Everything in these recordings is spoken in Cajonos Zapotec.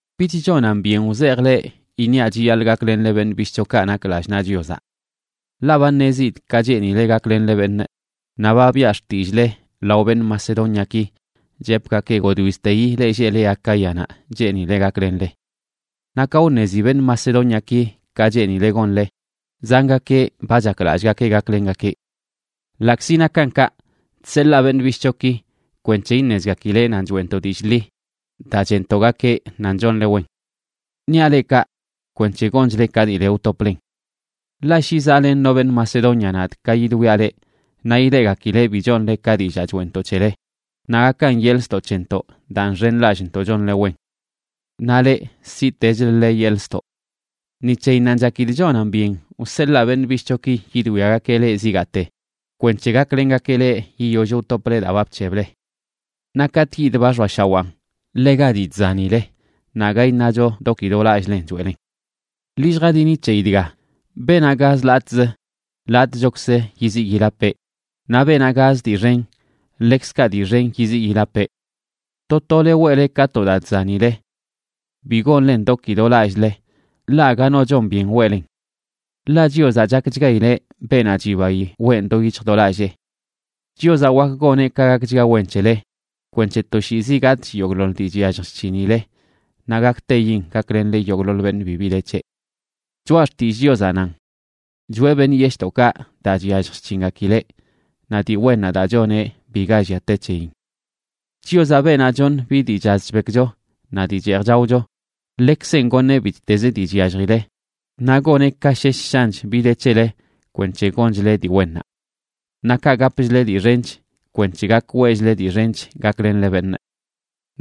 Bich chonan byen wzejꞌ leꞌ iṉiaꞌ chiyaḻꞌ gaklenle beṉꞌ bishꞌchokaꞌ nak lallꞌ naꞌ Chiozaꞌ. Ḻaꞌ ba ṉezidꞌ ka cheenile gaklenle beṉꞌ, naꞌ ba biꞌa xtillꞌle lao beṉꞌ Macedóniaki, chepgakee godwizteyi leꞌ lleꞌle Acáyanaꞌ cheenile gaklenle. Naꞌ ka wṉezi beṉꞌ Macedóniaki ka cheenile gonle, zangakeꞌ ba chaklallꞌgakeꞌ gaklengakeꞌ. Ḻaꞌkzi nakan kaꞌ, chseḻaa beṉꞌ bishꞌchoki kwenc̱he iṉezgakileꞌ nan choeꞌntoꞌ dillꞌ ḻi daa cheꞌntoꞌgakeꞌ nan chonle wen. Niaꞌ leꞌ kaꞌ kwenc̱he gonchle ka dii le wtoplen. Ḻaꞌ shi zaꞌlen no beṉꞌ Macedonia nadꞌ ka yidwiaꞌ leꞌ, naꞌ ileꞌgakileꞌ bi chonle ka dillaa choeꞌntoꞌ c̱hele, naꞌ gakan yeḻꞌ ztoꞌ c̱hentoꞌ daa nxenlallꞌntoꞌ chonle wen. Naꞌ leꞌ siꞌtechləle yeḻꞌ ztoꞌ. Ni c̱heyinnanꞌ chakidꞌ chonan byen wseḻaa beṉꞌ bishꞌchoki yidwiagakeꞌ leꞌ zigaate, kwenc̱he gaklengakeꞌ leꞌ yiyoll wtople daa ba bc̱heble. Naꞌ katꞌ yidꞌ, ba xoashawan ḻega dii chzanile, naꞌ aga iṉacho do ki do lallꞌlen choeꞌlen. Ḻi lljadini c̱heyi dga: Beenaꞌ gaz latꞌzə, latꞌchokzə yiziꞌ yilapeꞌ; naꞌ beenaꞌ gaz dii xen, ḻekzkaꞌ dii xen yiziꞌ yilapeꞌ. To tole weꞌle ka to daa chzanile. Bi gonlen do ki do lallꞌle, ḻaꞌ aga no chon byen weꞌlen. Ḻaꞌ Chiozaꞌ chakchgaileꞌ beenaꞌ chibayi weꞌn do yic̱hj do lallee. Chiozaꞌ wak goneꞌ ka gakchga wen c̱hele kwenc̱he toshiizi gatꞌch yogꞌḻoḻ dii chyallj chc̱hinile naꞌ gakteyin gaklenle yogꞌḻoḻ beṉꞌ bibi de c̱heꞌ. Choꞌa Xtillꞌ Chiozaꞌ nan: Choꞌe beṉꞌ yeshꞌdoꞌkaꞌ daa chyallj chc̱hingakileꞌ, naꞌ dii wennaꞌ daa choneꞌ biga llia te c̱heyin. Chiozaꞌ, beenaꞌ choṉ bi dii chaz chbekcho naꞌ dii cheej chaocho, ḻekzeꞌn goṉeꞌ bittezə dii chyalljile, naꞌ goneꞌ ka shesh shanch bi de c̱hele kwenc̱he gonchle dii wennaꞌ. Naꞌ kaꞌ, gapchle dii xench kwenc̱he gak weꞌchle dii xench gaklenle beṉꞌ.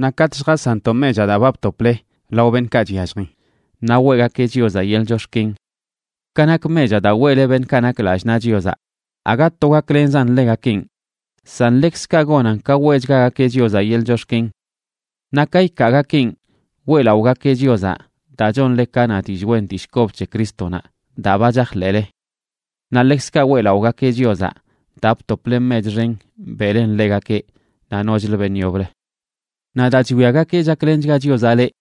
Naꞌ katꞌ lljasanntoꞌ mechaꞌ daa ba btople lao beṉꞌkaꞌ chyalljin, naꞌ weꞌgakeꞌ Chiozaꞌ yeḻꞌ chox̱ken. Ka nak mechaꞌ daa weꞌle beṉꞌkaꞌ nak lallꞌ naꞌ Chiozaꞌ, aga to gaklenzan ḻegakenꞌ, san ḻekzkaꞌ gonan ka weꞌchgagakeꞌ Chiozaꞌ yeḻꞌ chox̱ken. Naꞌ ka ikaagakeꞌn, weꞌlaꞌogakeꞌ Chiozaꞌ daa chonle ka na dillꞌ wen dillꞌ kob c̱he Crístonaꞌ daa ba chajḻeꞌle. Naꞌ ḻekzkaꞌ weꞌlaꞌogakeꞌ Chiozaꞌ daa btople mech xen beꞌlen ḻegakeꞌ naꞌ nochlə beṉꞌ yoblə. Naꞌ daa chwiagakeꞌ chaklenchga Chiozaꞌ leꞌ,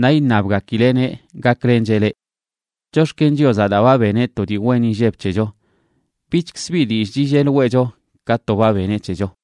naꞌ iṉabgakileꞌneꞌ gaklencheꞌ leꞌ. Chox̱ken Chiozaꞌ, daa ba beneꞌ to dii wen inlleb c̱hecho. Bichkzə bi dillꞌ chillel weꞌcho ka to ba beneꞌ c̱hecho.